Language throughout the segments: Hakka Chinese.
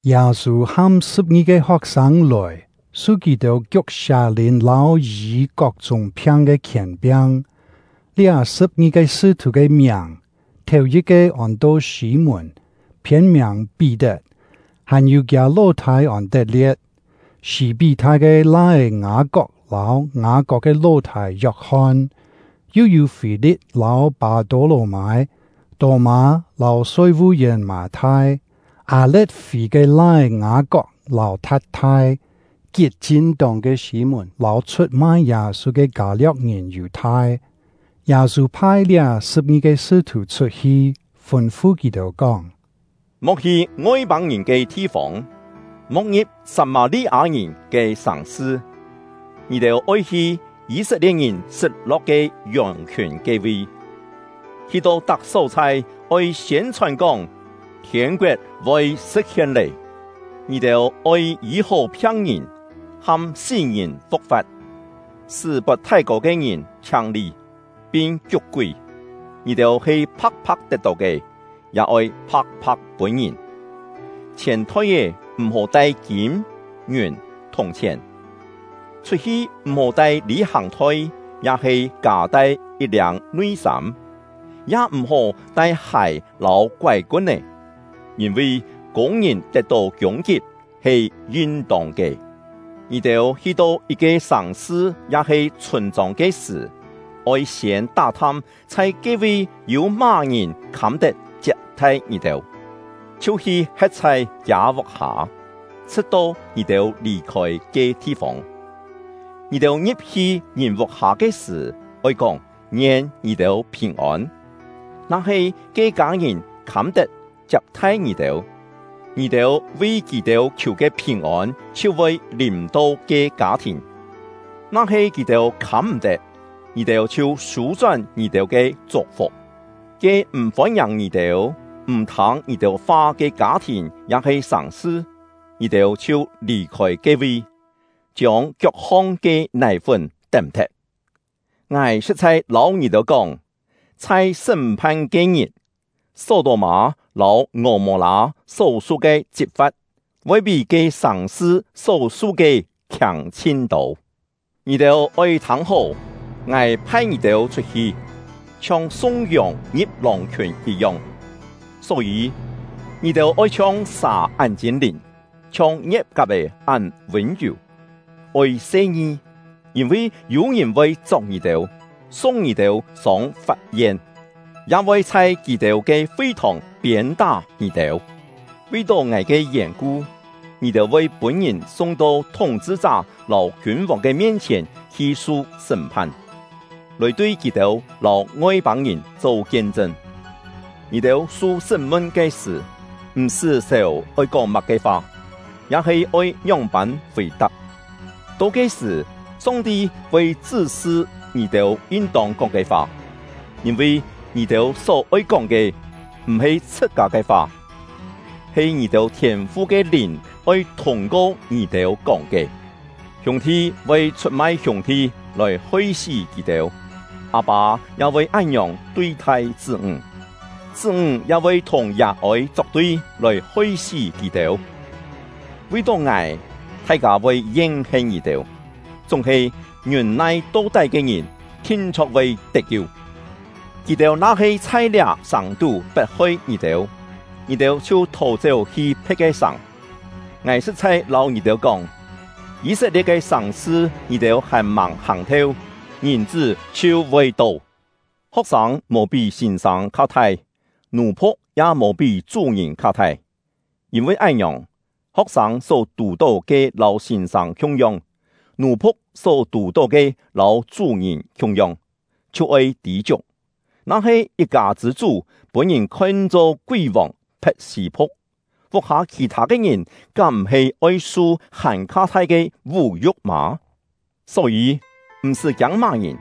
Yâ-sû ham sṳ̍p-ngi-ke ho̍k-sâng lòi, su kì-têu kiuk sià-lìn lâu yî kok-chúng phiang ke khièn-piang. Liá sṳ̍p-ngi-ke sṳ́-thù ke miàng: Thèu-yit-ke ôn-to Sî-mùn (phiên-miàng Pí-tet), hàn-yû kiâ ló-thâi Ôn-tet-lie̍t, Sî-pí-thai ke lai-é Ngâ-kok, lâu Ngâ-kok ke ló-thâi Yok-hon; yu yû Fî-li̍t lâu Pâ-tô-lò-mâi; Tô-mâ lâu soi-vu-yèn Mâ-thai; Â-le̍t-fî ke lai-é Ngâ-kok lâu Tha̍t-thai; Kit-chin-tóng ke Sî-mùn lâu chhut-mai Yâ-sû ke Kâ-lio̍k-ngìn Yù-thai. Yâ-sû phai liá sṳ̍p-ngi-ke sṳ́-thù chhut-hi, fûn-fu kì-têu kóng: “Mo̍k hi Ngoi-pâng-ngìn ke thi-fông, mo̍k ngi̍p Sat-mâ-li-â-ngìn ke sàng-sṳ. Ngì-têu oi hi Yî-set-lie̍t-ngìn sṳt-lo̍k ke yòng-khiùn ke-vi. Hi-to tak só-chhai, oi siên-chhòn kóng: ‘Thiên-koet voi sṳ̍t-hien lé!’ Ngì-têu oi yî-hó phiang-ngìn, ham sí-ngìn fu̍k-fa̍t, sṳ́ pot thái-kô ke ngìn chhiang-li, pin kiuk-kúi. Ngì-têu he pha̍k-pha̍k tet-tó ke, ya oi pha̍k-pha̍k pûn ngìn. Chhièn-thoi-é m̀-hó tai kîm, ngiùn, thùng-chhièn; chhut-hi m̀-hó tai lî-hàng-thoi ya-he kâ tai yit-liâng nui-sâm, ya m̀-hó tai hài lâu koái-kun-é. Yîn-vi kûng-ngìn tet-tó kiûng-kip he yin-tông ke. “Ngì-têu hi-to yit-ke sàng-sṳ ya-he chhûn-chông ke sṳ̀, oi siên tá-tham chhai ke-vi yû má-ngìn khâm-tet chiap-thai ngì-têu, chhiu hi he̍t chhai kiâ vuk-hâ, chhṳ̍t-to ngì-têu lì-khôi ke thi-fông. Ngì-têu ngi̍p-hi ngìn vuk-hâ ke sṳ̀, oi kóng: ‘Ngien ngì-têu phìn-ôn.’ Na-he ke-kâ ngìn khâm-tet chiap-thai ngì-têu, ngì-têu vi kì-têu khiù ke phìn-ôn chhiu voi lìm-to ke kâ-thìn. Na-he kì-têu khâm-m̀-tet, ngì-têu chhiu sû-chón ngì-têu ke chuk-fuk. Ke m̀ fôn-ngiàng ngì-têu, m̀ thâng ngì-têu fa ke kâ-thìn ya-he sàng-sṳ, ngì-têu chhiu lì-khôi ke-vi, chiông kiok-hong ke nài-fún tém-thet. Ngài sṳ̍t-chhai lâu ngì-têu kóng, chhai sṳ́m-phan ke-ngit, Só-tô-mâ lâu Ngò-mô-lâ só-su ke chit-fa̍t, voi pí ke sàng-sṳ só-su ke khiâng chhin-tô!” “Ngì-têu oi thâng-hó! Ngài phai ngì-têu chhut-hi, chhiong sung yòng ngi̍p lòng-khiùn yit-yong. Só-yî, ngì-têu oi chhiong sà án chîn-lìn, chhiong ngie̍t-kap-è án vûn-yù. Oi se-ngi, yîn-vi yû-ngìn voi chok ngì-têu, sung ngì-têu sông fap-yen, ya voi chhai kì-têu ke fi-thòng piên-tá ngì-têu. Vi-tó ngài ke yèn-ku, ngì-têu voi pûn-ngìn sung-to thúng-chhṳ-chá lâu kiûn-vòng ke mien-chhièn hi su sṳ́m-phan, lòi tui kì-têu lâu Ngoi-pâng-ngìn cho kien-chṳn. Ngì-têu su sṳ́m-mun ke sṳ̀, m̀-sṳ́ sèu oi kóng má-ke fa, ya-he oi ngióng-pân fì-tap; to ke-sṳ̀, Song-ti voi chṳ́-sṳ ngì-têu yin-tông kóng ke fa. Yîn-vi ngì-têu só-oi kóng ke, m̀-he chhṳ-kâ ke fa, he ngì-têu Thiên-fu ke Lìn oi thûng-ko ngì-têu kóng ke. “Hiûng-thi voi chhut-mai hiûng-thi lòi hoi-sí kì-têu; â-pâ ya voi án-ngiòng tui-thai chṳ́-ńg; chṳ́-ńg ya voi thùng yà-ôi chok-tui lòi hoi-sí kì-têu. Vi-tó ngài, thai-kâ voi yen-hen ngì-têu; chúng-he ngiûn-nai to-tái ke ngìn thin-chho̍k voi tet-kiu. Kì-têu na-he chhai liá-sàng tú pet-hoi ngì-têu, ngì-têu chhiu thò-chéu hi phe̍t ke sàng. Ngài sṳ̍t-chhai lâu ngì-têu kóng, Yî-set-lie̍t ke sàng-sṳ ngì-têu hàn-màng hàng-theu, Ngìn-chṳ́ chhiu voi to. “Ho̍k-sâng mò pí sîn-sâng kha-thai, nù-phu̍k ya mò pí chú-ngìn kha-thai. Yîn-vi án-ngiòng, ho̍k-sâng só tù-tó ke lâu sîn-sâng khiung-yong, nù-phu̍k só tù-tó ke lâu chú-ngìn khiung-yong, chhiu oi tî-chiuk. Na-he yit-kâ chṳ̂-chú pûn-ngìn khon-cho kúi-vòng Phe̍t-sî-puk, vuk-hâ khì-thâ ke ngìn kám m̀-he oi su hàn-kha thai ke vú-yu̍k mâ? “Só-yî, m̀-sṳ́ kiâng má-ngìn;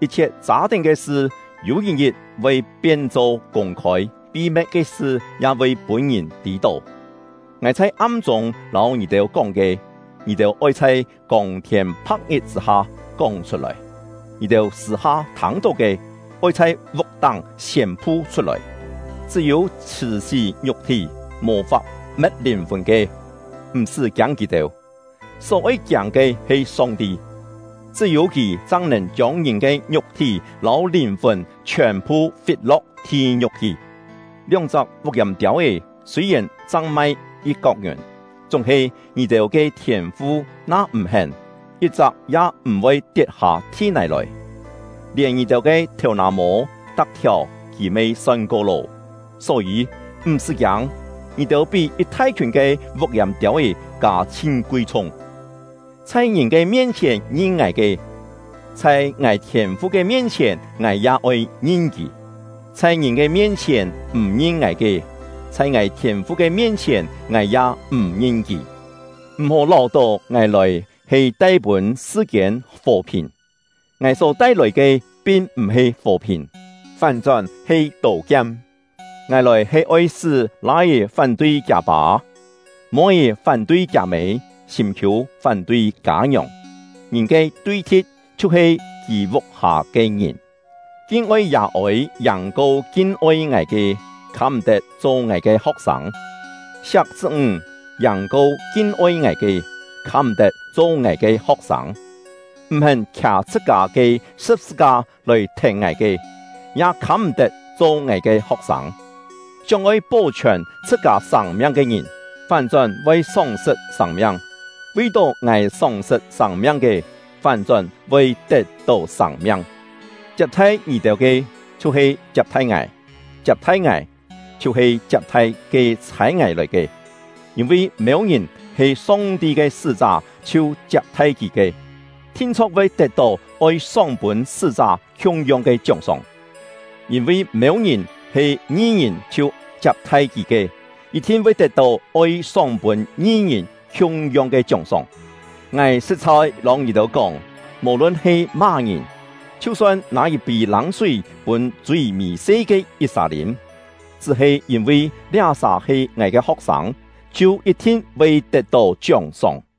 yit-chhiet châ-tén ke sṳ yû yit-ngit voi pien-cho kûng-khôi, pi-me̍t ke sṳ ya voi pûn-ngìn tî-tó. Ngài chhai am-chûng lâu ngì-têu kóng ke, ngì-têu oi chhai kông-thiên pha̍k-ngit chṳ̂-ha kóng chhut-lòi; ngì-têu sṳ̂-ha thâng-tó ke, oi chhai vuk-táng siên-pu chhut-lòi. Chṳ́-yû chhṳ̀-sí ngiuk-thí, mò-fap me̍t lìn-fùn ke, m̀-sṳ́ kiâng kì-têu; só-oi kiâng ke he Song-ti, chṳ́-yû Kì chang nèn chiông ngìn ke ngiuk-thí lâu lìn-fùn chhiòn-phu fit-lo̍k thi-ngiu̍k hi. Lióng-chak vuk-yàm-tiâu-é sûi-yèn chang mai yit-kok ngiùn, chúng-he ngì-têu ke Thiên-fu na m̀-hén, yit-chak ya m̀-voi tiet-hâ thi-nài lòi. Lièn ngì-têu ke thèu-nà-mô tak-thiàu Kì me son-ko lô! Só-yî, m̀-sṳ́ kiâng, ngì-têu pí yit thai-khiùn ke vuk-yàm-tiâu-é kâ chhin kui-chhung! “Chhai ngìn ke mien-chhièn ngin ngài ke, chhai ngài Thiên-fu ke mien-chhièn ngài ya oi ngin kì; chhai ngìn ke mien-chhièn m̀ ngin ngài ke, chhai ngài Thiên-fu ke mien-chhièn ngài ya m̀ ngin kì. “M̀-hó láu-tó ngài lòi he tai-pûn sṳ-kiên fò-phìn; ngài só tai-lòi ke pin m̀-he fò-phìn, fán-chón he tô-kiam. Ngài lòi he oi sṳ́ lai-é fán-tui kiâ-pâ, moi-é fán-tui kiâ-mê, sîm-khiû fán-tui kâ-ngiòng. Ngìn ke tui-thi̍t chhiu-he kì vuk-hâ ke ngìn. “Kin-oi yà-ôi yàng-ko kin-oi ngài ke, khâm-m̀-tet cho ngài ke ho̍k-sâng; siak chṳ́-ńg yàng-ko kin-oi ngài ke, khâm-m̀-tet cho ngài ke ho̍k-sâng; m̀-hén khià chhṳ-kâ ke sṳ̍p-sṳ-ka lòi thèn ngài ke, ya khâm-m̀-tet cho ngài ke ho̍k-sâng. Sióng-oi pó-chhiòn chhṳ-kâ sâng-miang ke ngìn, fán-chón voi sóng-sṳt sâng-miang; vi-tó ngài sóng-sṳt sâng-miang ke, fán-chón voi tet-tó sâng-miang. “Chiap-thai ngì-têu ke, chhiu-he chiap-thai ngài; chiap-thai ngài, chhiu-he chiap-thai ke chhâi ngài lòi ke. Yîn-vi mêu-ngìn he Song-ti ke sṳ́-chá chhiu chiap-thai kì ke, thin-chho̍k voi tet-tó oi sóng-pûn sṳ́-chá khiung-yong ke chióng-sóng; yîn-vi mêu-ngìn he ngi-ngìn chhiu chiap-thai kì ke, yit-thin voi tet-tó oi sóng-pûn ngi-ngìn khiung-yong ke chióng-sóng. Ngài sṳ̍t-chhai lâu ngì-têu kóng, mò-lun he má-ngìn, chhiu-son nâ yit-pî lâng-súi pûn chui mì-se ke yit-sà lîm, chṳ́-he yîn-vi liá-sà he ngài ke ho̍k-sâng, chhiu yit-thin voi tet-tó chióng-sóng.”